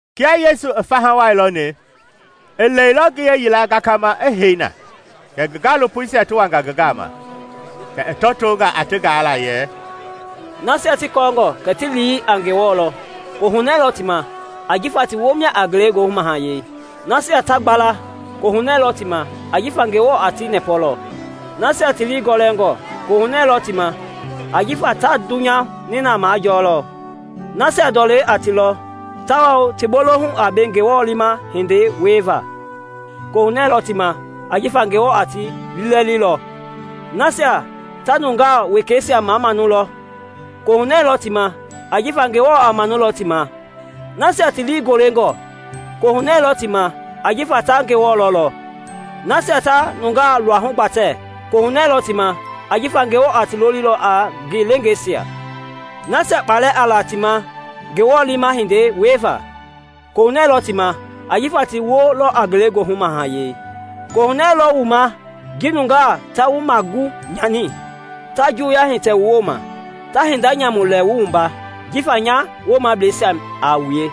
Kia Yesu i faha wai lɔni, i lɛilɔ ngiye yila gakama i hei na, kɛ ngi gaalopoisia ti wanga ngi gama. Kɛ i tɔtonga a ti gaala yɛ: “Nasia ti kɔɔngɔ kɛ ti lii a Ngewɔ lɔ, kohunɛ lɔ ti ma, ajifa ti woo mia a Ngelegoohu mahayɛi. “Nasia ta gbala, kohunɛ lɔ ti ma, ajifa Ngewɔ a ti nɛpɔlɔ. “Nasia ti lii gɔlɛngɔ kohunɛ lɔ ti ma, ajifa ta dunya nina majɔlɔ. “Nasia ndɔlɛ a ti lɔ, tawao ti bolohu a be Ngewɔ liima hindei wiela, kohunɛ lɔ ti ma, ajifa Ngewɔ a ti lilɛlilɔ. “Nasia ta nungaa wekeisia mamanu lɔ, kohunɛ lɔ ti ma ajifa Ngewɔ a manulɔ ti ma. “Nasia ti lii golengɔ, kohunɛ lɔ ti ma ajifa ta Ngewɔ lɔlɔ. “Nasia ta nungaa luahu gbatɛ kohunɛ lɔ ti ma ajifa Ngewɔ a ti lolilɔ a ngi leengeisia. “Nasia kpalɛ a la ti ma Ngewɔ liima hindei wieva, kohunɛ lɔ ti ma ajifa ti woo lɔ a Ngelegoohu Mahayɛi. “Kohunɛ lɔ wu ma ji nungaa ta wu magu nyani, ta juwuya hitɛ wu woma, ta hinda nyamu lɛ wu wumba jifa nya woomableisia a wue.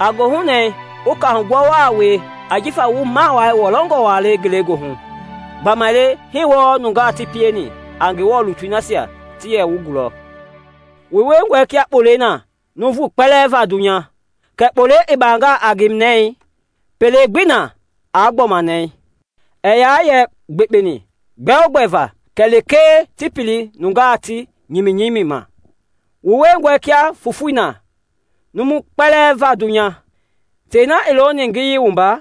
A gohunɛ wu kaahugbua wa wie ajifa wu mawaa wɔlɔngɔ wa le Ngelegoohu, gbamaile hii wɔɔ nungaa ti pieni a Ngewɔ lutui nasia ti yɛ wu gulɔ. “Wu wiengɔe kia kpolei na nuuvu kpɛlɛɛ va dunya. Kɛɛ kpolei i baangaa a ngi nɛi, pele gbii na aa gbɔma nɛɛ. Ɛɛ yaa yɛ gbekpeni gbɛogbɛ va kɛ lekee ti pili nungaa ti nyiminyimi ma. “Wu wiengɔe kia fofoi na numui kpɛlɛɛ va dunya. Tei na i looni ngiyei wumba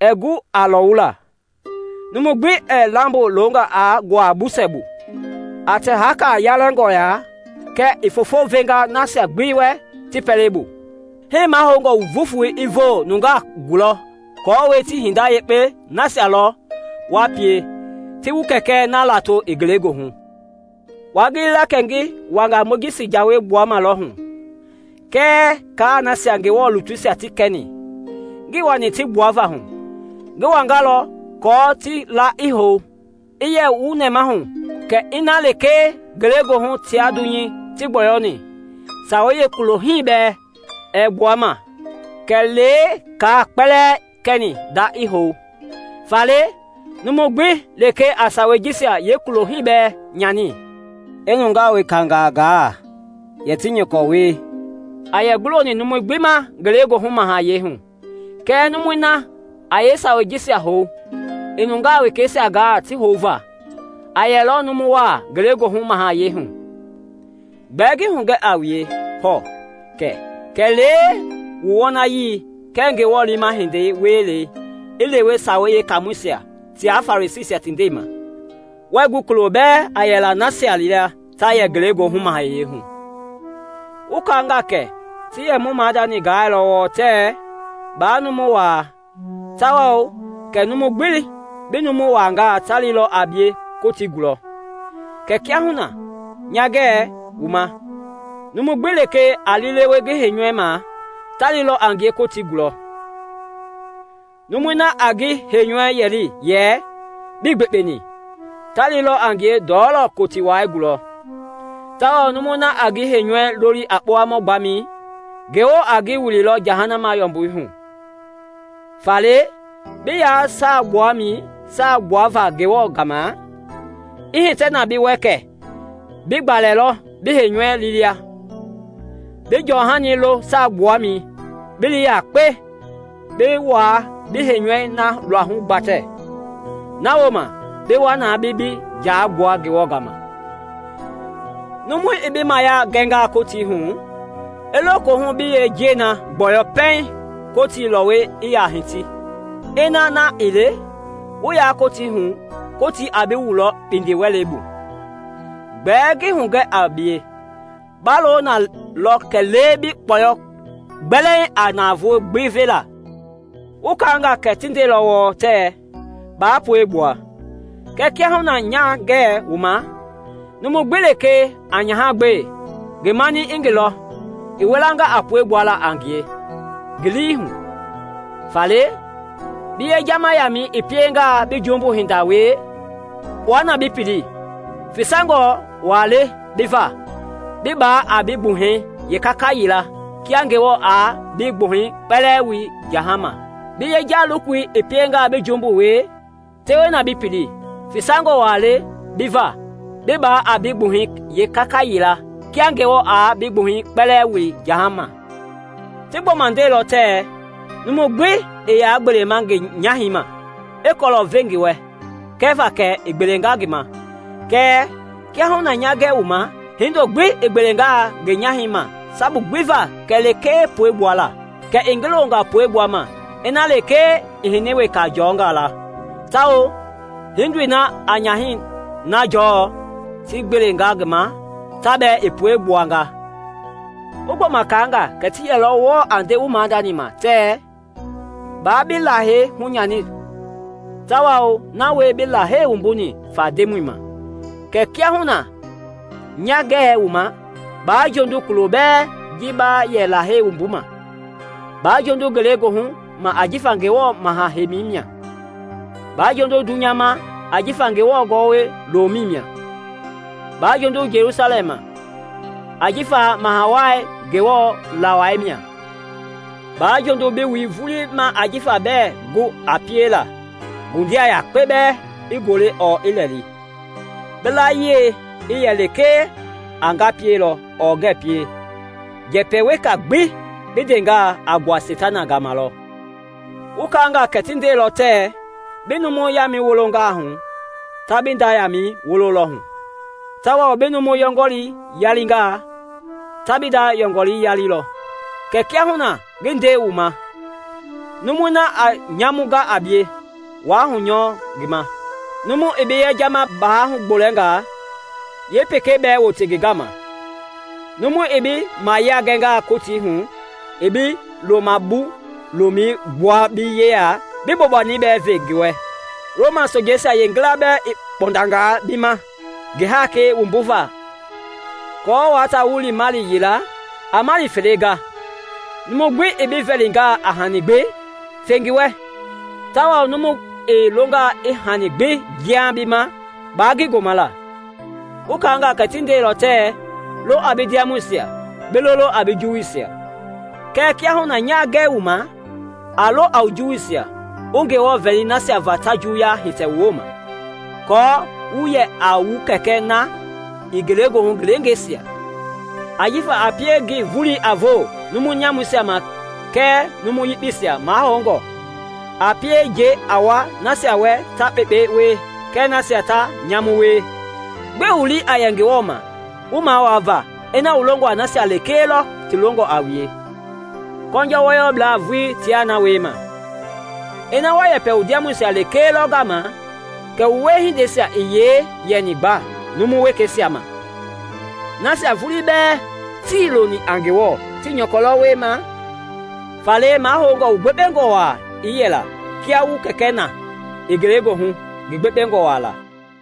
ɛɛ gu a lɔwulaa. Numu gbi ɛɛ lambo longa aa nguaa busɛ bu, a tɛ haaka yalɛngɔ lɔ ya kɛ i fofo venga nasia gbi wɛ ti pɛlei bu. Hii mahoungɔ wu voofoi i voo nungaa gulɔ aako ti hinda yekpei nasia lɔ wa pie, ti wu Kɛkɛ na lato i ngelegoohu. “Waa gili la kɛ ngi wanga Mojisi Jawei gbuamalɔ hu kɛɛ kaa nasia Ngewɔ lutuisia ti kɛni. Ngii wani ti gbuava hu; ngi wangalɔ aako ti la i hou. I yɛ wu nɛmahu kɛ ina lekee Ngelegoohu tia dunya tii gbɔyɔni, sawei yeekulo hii bɛɛ ɛɛ gbua ma kɛlee kaa kpɛlɛɛ i kɛni nda i hou. Faale numu gbi lekee a sawei jisia yeekulo hii bɛɛ nyani, i nungaa wekangaa gaa yɛ ti nyɔkɔ wie, a yɛ guloni numui gbi ma Ngelegoohu Mahayɛi hu; kɛɛ numui na a yeesawei jisia hou, i nungaa wekeisia gaa ti houva, a yɛlɔ a numu wa Ngelegoohu Mahayɛi hu. Gbɛɛ ngi hugɛ a wue hɔɔ kɛ kɛlee wu wɔnayii kɛɛ Ngewɔ liima hindei wielei a lewe Sawei Yekaamɔisia tia Farisiisia ti ndɛi ma, wɛɛ gu kulo bɛɛ a yɛlaa nasia lia ta yɛ Ngelegoohu Mahayɛi hu. “Wu kaanga kɛ ti yɛ mu maadani gaalɔ wɔɔ tɛɛ, ‘Baa numu waa; tawao’ kɛ ‘numu gbi bi numu waangaa ta lilɔ a bie Kotii gulɔ.’ Kɛɛ kiahuna nya ngɛɛ wu ma, numu gbi lekee a liilewe ngi heinyɔui ma, ta lilɔ a ngie Kotii gulɔ; numui na a ngi heinyɔui yɛli yɛ ‘Bii gbekpeni!’ ta lilɔ a ngie ndɔlɔ Kotii wai gulɔ, tawao numui na a ngi heinyɔui loli a kpowamɔ gbamɛi, Ngewɔ a ngi wililɔ jahama yɔmbui hu. Faale bi yaa saagbuamɛi saa gbuava Ngewɔ gama, i hitɛ na bi wɛ kɛ bi gbalɛ lɔ bi heinyɔui liima, bi jɔhani lo saagbuamɛi bi li yakpe bi wua bi heinyɔui na luahu gbatɛ, na wooma bi wa na bi bi jaai gbua Ngewɔ gama. “Numu i bi mayia gɛngaa Kotii hu, i lo kohu bi yeenjiɛi gbɔyɔ pɛiŋ Kotii lɔwɔi i ya hiti. Ina na ii le, wu ya Kotii hu, Kotii a bi wulɔ kpindiwɛlei bu. Gbɛɛ ngi hugɛ a bie, ba lo na lɔ kɛlee bi kpɔyɔ gbɛlɛɛŋ a navoei gbi vela. “Wu kaanga kɛ ti ndeilɔ wɔɔ tɛɛ, ‘Baa puegbua.’ Kɛɛ kiahuna nya ngɛ wu ma, numu gbi lekee a nyaha gbe, ngi mani i ngi lɔ, i wilanga a pue gbuala a ngie ngi lii hu. Faale bi yejama yaamɛi i piengaa bi jumbu hinda wie, kpua na bi pili; fisangɔ wa le bi va bi baa a bi gbuhɛi yeekaka yila kia Ngewɔ aa bi gbuhɛi kpɛlɛɛ wili jahama. Bi yeja-lokoi i piengaa bi jumbu wie, tewe na bi pili; fisangɔ wa le bi va bi baa a bi gbuhɛi yeekaka yila kia Ngewɔ aa bi gbuhɛi kpɛlɛɛ wili jahama. “Ti gbɔma ndeilɔ tɛɛ, ‘Numu gbi i ya gbelema ngi nyahɛi ma, i kɔlɔ ve ngi wɛ kɛva kɛ i gbelenga ngi ma.’ Kɛɛ kiahuna nya ngɛɛ wu ma, hindo gbi i gbelengaa ngi nyahɛi ma sabu gbi va kɛ lekee pue gbuala, kɛ i ngi longa pue gbuama ina lekee i hini weka jɔngalɔ; tawao hiindoi na a nyahɛi na jɔɔ ti gbelenga ma, ta bɛɛ i pue gbuanga. “Wu gbɔma kaanga kɛ ti yɛlɔ wɔɔ a nde mu maadani ma tɛɛ, ‘Baa bi Lahei hunyani tawao na wie bi Lahei wumbuni fa Ndemɔi ma.’ Kɛɛ kiahuna nya ngɛɛ wu ma, baa jondu kulo bɛɛ ji ba yɛ Lahei wumbuma; baa jondu ngelegoohu ma ajifa Ngewɔ maha-heimi mia; baa jondu dunyei ma ajifa Ngewɔ gɔwɔ lomɛi mia. Baa jondu Jelusalɛm ma ajifa Maha Wai Ngewɔ la wai mia. Baa jondu bi wui vulii ma ajifa bɛɛ gu a piela ngundia yakpe bɛɛ i gole ɔɔ i lɛli. Bi layie i yɛ lekee a ‘Nga pielɔ’ ɔɔ ‘Ngɛɛ pie’; njɛpɛ weka gbi bi ndengaa, a gbua Seitana gama lɔ. “Wu kaanga kɛ ti ndeilɔ tɛɛ, ‘Bi numu yaamɛi wolongaa hu, ta bi nda yaamɛi wololɔ hu, tawao bi numu yɔngɔlii yalingaa, ta bi nda yɔngɔlii yalilɔ.’ Kɛɛ kiahuna ngi nde wu ma, numui na a nyamu ga a bie wa hunyɔɔ ngi ma. Numu i bi yejama bawɛi hugbolɛngaa, yeepekei bɛɛ wote ngi gama. Numu i bi mayia gɛngaa Kotii hu i bi loma-bu-lomɛi gbua bi yeya, bi bobani bɛɛ ve ngi wɛ. Roma sojeisia yeengila i kpɔndangaa bi ma ngi haakei wumbuva aako wua ta wu li maili yila, a maili fele ga. Numu gbi i bi vɛlingaa a hani gbi, fe ngi wɛ, tawao numu i longaa i hani gbi jiaŋ bi ma, baa ngi goma la. “Wu kaanga kɛ ti ndeilɔ tɛɛ, ‘Lo a bi ndiamɔisia, bi lolo a bi juwuisia.’” Kɛɛ kiahuna nya ngɛ wu ma, a lo a wu juwuisia, wu Ngewɔ vɛli nasia va ta juuya hitɛ wu woma, aako wu yɛ a wu Kɛkɛ na i Ngelegoohu ngi leengeisia. Ajifa a pie ngi volei a voo numu nyamuisia ma kɛɛ numu yekpeisia mahɔɔngɔ, a pie njɛi a wua nasia wɛ ta kpekpei wie kɛɛ nasia ta nyamui wie. Gbɛe wu lii a yɛ Ngewɔ ma wu mawaa va ina wu longɔ a nasia lekee lɔ ti longɔ a wue? Kɔnjɔ wɔyɔblaa vuii tia na wiema. Ina wa yɛpɛ wu ndiamɔisia lekee lɔ gama, kɛ wu wiehindei i yee yɛni gba numu wekeisia ma? Nasia vulii bɛɛ tii loni a Ngewɔ ti nyɔkɔ lɔ wiema! Faale mahoungɔ wu gbekpengɔ waa i yɛla kia wu kɛkɛ na i Ngelegoohu ngi gbekpengɔ waa la.